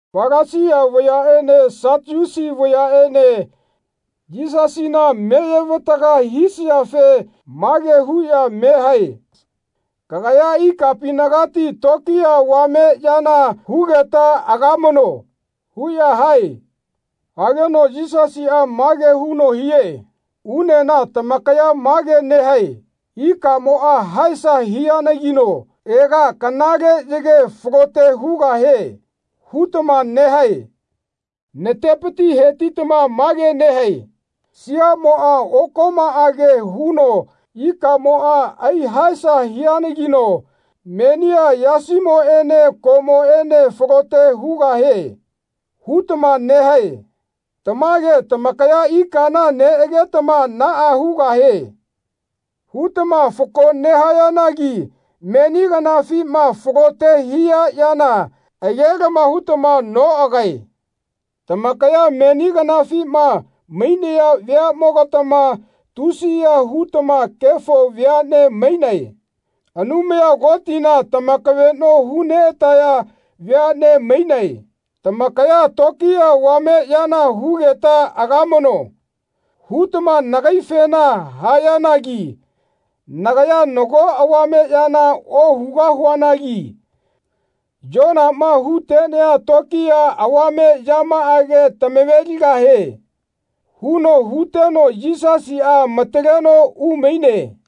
Falasia vayaꞌene Satiusi vayaꞌene Yisasina meye-vataga hisayafe mage huꞌya me hae “Kagaya ikapinagati tokiya avame yana hugeta agamano.” huꞌya hae. Hageno Yisasiꞌa mage huno hie “Unena tamakaya mage nehae ‘Ikamoꞌa haesa hianagino ega kanale yage falote hugahie.’ hutama nehae. Natepiti hetitama mage nehae siaꞌmoꞌa okomaꞌage huno ikamoꞌa ai-haesa hianagino ‘Menia yasimoꞌene koꞌmoꞌene falote hugahie.’ hutama nehae. Tamage tamakaya ikana neꞌagetama ‘Naꞌa hugahie.’ hutama fako nehayanagi meni kanafima falote hia yana age-lama hutama noꞌagae. Tamakaya meni kanafima mainaya veaꞌmogatama tusiya hutama kefo veaꞌne mainae. Anumaya Kotina tamakaveꞌno hu-neꞌataya veaꞌne mainae. Tamakaya ‘Tokiya avame yana hugeta agamano.’ hutama nagaifena hayanagi nagaya nago avame yana ohugahuanagi Yonama hu-tenea tokiya avame yamaꞌage tamave-ligahie.” huno huteno Yisasiꞌa amataleno umaine.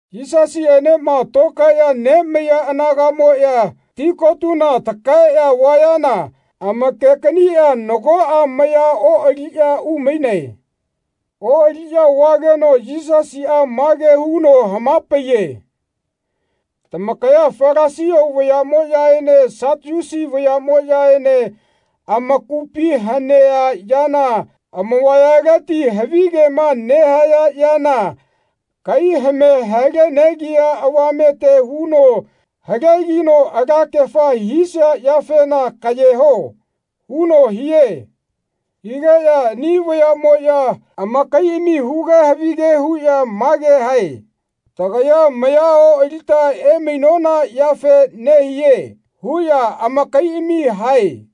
Yisasiꞌenema tokaeꞌya nemaiya anagaꞌmoꞌya tikotuna lakaeꞌya vayana amake-kaniꞌya nagoꞌa maya oꞌaliꞌya umainae. Oꞌaliꞌya vageno Yisasiꞌa mage huno hama-paiye “Tamakaya Falasia vayaꞌmoꞌyaene Satiusi vayaꞌmoꞌyaene amakupi hanea yana age-lama ohuꞌya amavayaleti havigema nehaya yana kai hame hale-negia avamete huno halegino alakefa hisia yafena kaꞌye ho.” huno hie. Higeꞌya ani vayaꞌmoꞌya amakaiꞌami huge havige huꞌya mage hae “Tagaya maya oꞌalita emainona yafe nehie.” huꞌya amakaiꞌami hae.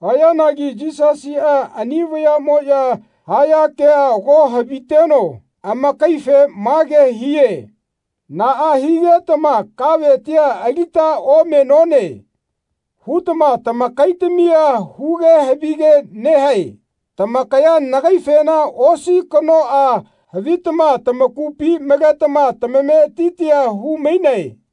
Hayanagi Yisasiꞌa ani vayaꞌmoꞌya haya kea ago haviteno amakaife mage hie “Naꞌa higetama ‘Kavetia alita omenone.’ hutama tamakaitamia huge havige nehae. Tamakaya nagaifena osi kanoꞌa havitama tamakupi maletama tamametitia hu-mainae.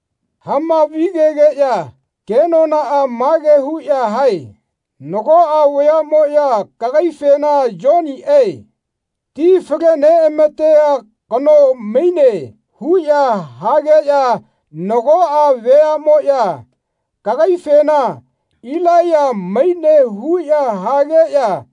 Hamavi-gegeꞌya kenonaꞌa mage huꞌya hae “Nagoꞌa vayaꞌmoꞌya kagaifena Yoniꞌe, ti fale-neꞌamatea kano, maine huꞌya hageꞌya nagoꞌa veaꞌmoꞌya kagaifena Ilaiya maine huꞌya hageꞌya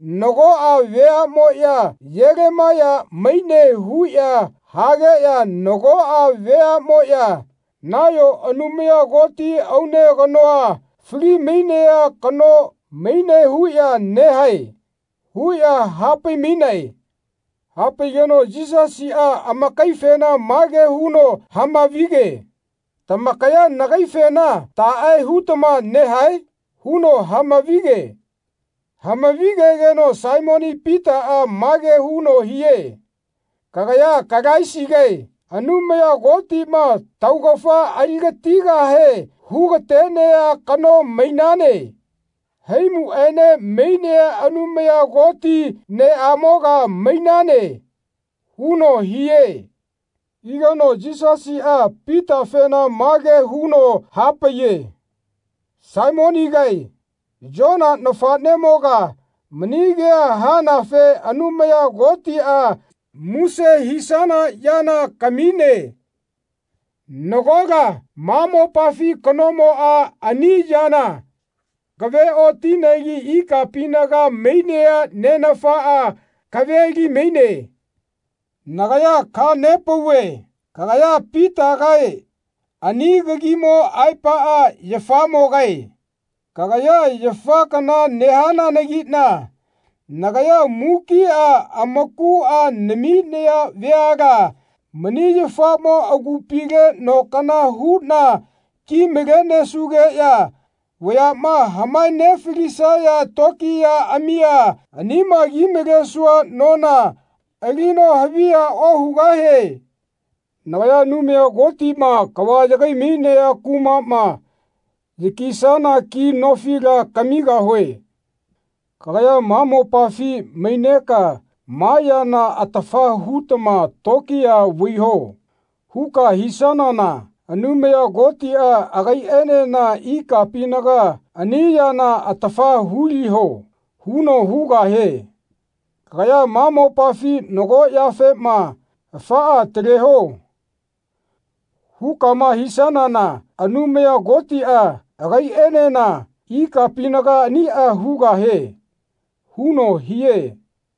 nagoꞌa veaꞌmoꞌya Yelemaiya maine huꞌya hageꞌya nagoꞌa veaꞌmoꞌya nayo Anumaya Koti aune kanoa fali-mainea kano maine huꞌya nehae.” huꞌya hapai-mainae. Hapaigeno Yisasiꞌa amakaifena mage huno hama-vige “Tamakaya nagaifena taꞌe hutama nehae?” huno hamavi-ge. Hamavi-gegeno Saimoni Pitaꞌa mage huno hie “Kagaya Kalaisigae, Anumaya Kotiꞌma taugafa ali-gatigahe hu-ga-tenea kano mainane. Haimuꞌaene mainea Anumaya Koti neꞌamoga mainane.” huno hie. Higeno Yisasiꞌa Pitafena mage huno hapaiye “Saimonigae, Yona nafaꞌnemoga, mani kea hanafe Anumaya Kotiꞌa muse hisana yana kamine. Nagola ma mopafi kanomoꞌa ani yana kaveꞌotinegi ikapinaga mainea Nenafa kave-li-maine. Nagaya kaha-nepauve kagaya Pitagae ani kagimo aepaꞌa yafamogae. Kagaya yafa kana nehananagiꞌna nagaya mukiꞌa amakuꞌa naminaya veala mani yafaꞌmo agupile no kana huꞌna ki-malenesugeꞌya vayaꞌma hamae-nefalisaya tokiyaꞌamia anima ki-malesua nona alino haviya ohugahie. Nagaya Anumaya Kotiꞌma kava yagai-mainea kumaꞌma yakisana ki nofila kamigahue. Kagaya ma mopafi maineka ‘Ma yana atafa hutama tokiya vaiho.’ huka hisanana Anumaya Kotiꞌa agaiꞌenena ikapinaga ‘Ani yana atafa hu-liho.’ huno hugahie. Kagaya ma mopafi nago yafema ‘Afaꞌa ataleho.’ hukama hisanana Anumaya Kotiꞌa agaiꞌenena ikapinaga aniꞌa hugahie.” huno hie.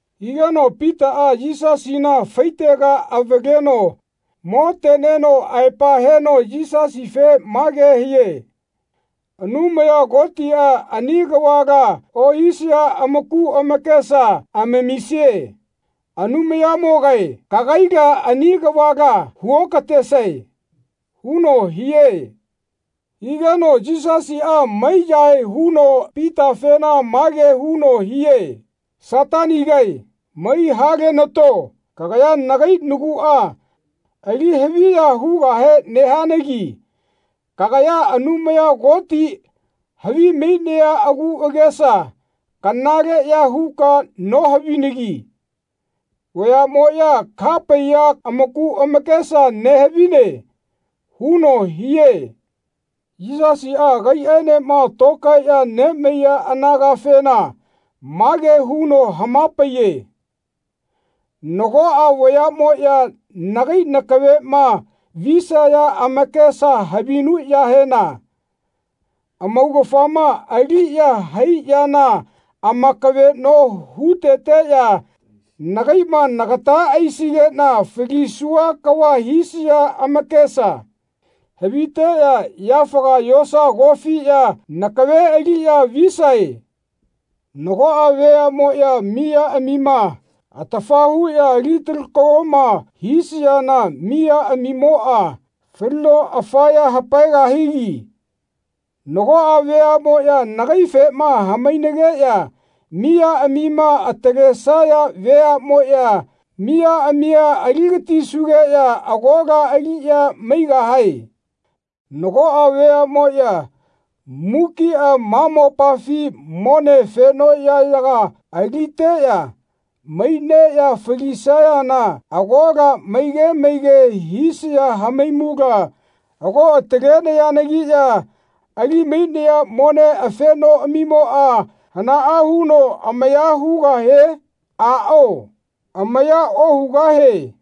Higeno Pitaꞌa Yisasina faitega avaleno moteneno aepa heno Yisasife mage hie “Anumaya Kotiꞌa ani kavala ohisaya amaku amakesa amamisie. Anumayanimogae kagaila ani kavala hu-okatesae.” huno hie. Higeno Yisasiꞌa mai-yahae huno Pitafena mage huno hie “Satanigae mai halenato kagaya nagai naguꞌa ali haviya hugahe nehanagi kagaya Anumaya Koti havimainea aguꞌagesa kanaleꞌya huka nohavinagi vayaꞌmoꞌya kaha-paiya amaku amakesa nehavine.” huno hie. Yisasiꞌa agaiꞌaenema tokaeꞌya nemaiya anagafena mage huno hama-paiye “Nagoꞌa veaꞌmoꞌya nagai nakaveꞌma visaya amakesa havinuꞌyahena amaugafama aliꞌya hai yana amakaveꞌno hu-teteꞌya nagaiꞌma nagata aisigeꞌna falisua kava hisaya amakesa haviteꞌya yafaga yosa kofiꞌya nakave aliꞌya visae. Nagoꞌa veaꞌmoꞌya maiyaꞌamima atafa huꞌya ali-talakoma hu-lisayana maiyaꞌamimoꞌa falino afaya hapaegahigi nagoꞌa veaꞌmoꞌya nagaifema hamainageꞌya maiyaꞌamima atalesaya veaꞌmoꞌya maiyaꞌamia ali-gatisugeꞌya agola aliꞌya maigahae. Nagoꞌa veaꞌmoꞌya mukiꞌa ma mopafi mone afenoꞌyaꞌyaga aliteꞌya maineꞌya falisayana agola maige maige hisaya haimula ago atalenayanagiꞌya ali-mainaya mone afenoꞌamimoꞌa hanaꞌa huno amaya hugahie? Aꞌao amaya ohugahie.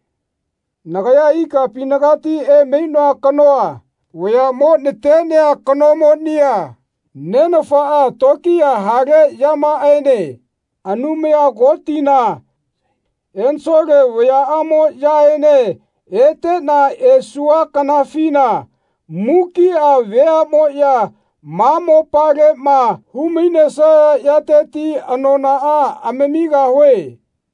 Nagaya ikapinagati emainoa kanoa vayaꞌmo natenea kanomonia Nenafaꞌa tokiya hale yamaꞌaene Anumaya Kotina ensole vayaꞌamoꞌyaene eteꞌna esua kanafina mukiꞌa veaꞌmoꞌya ma mopaleꞌma hu-mainesaya yateti anonaꞌa amamigahue.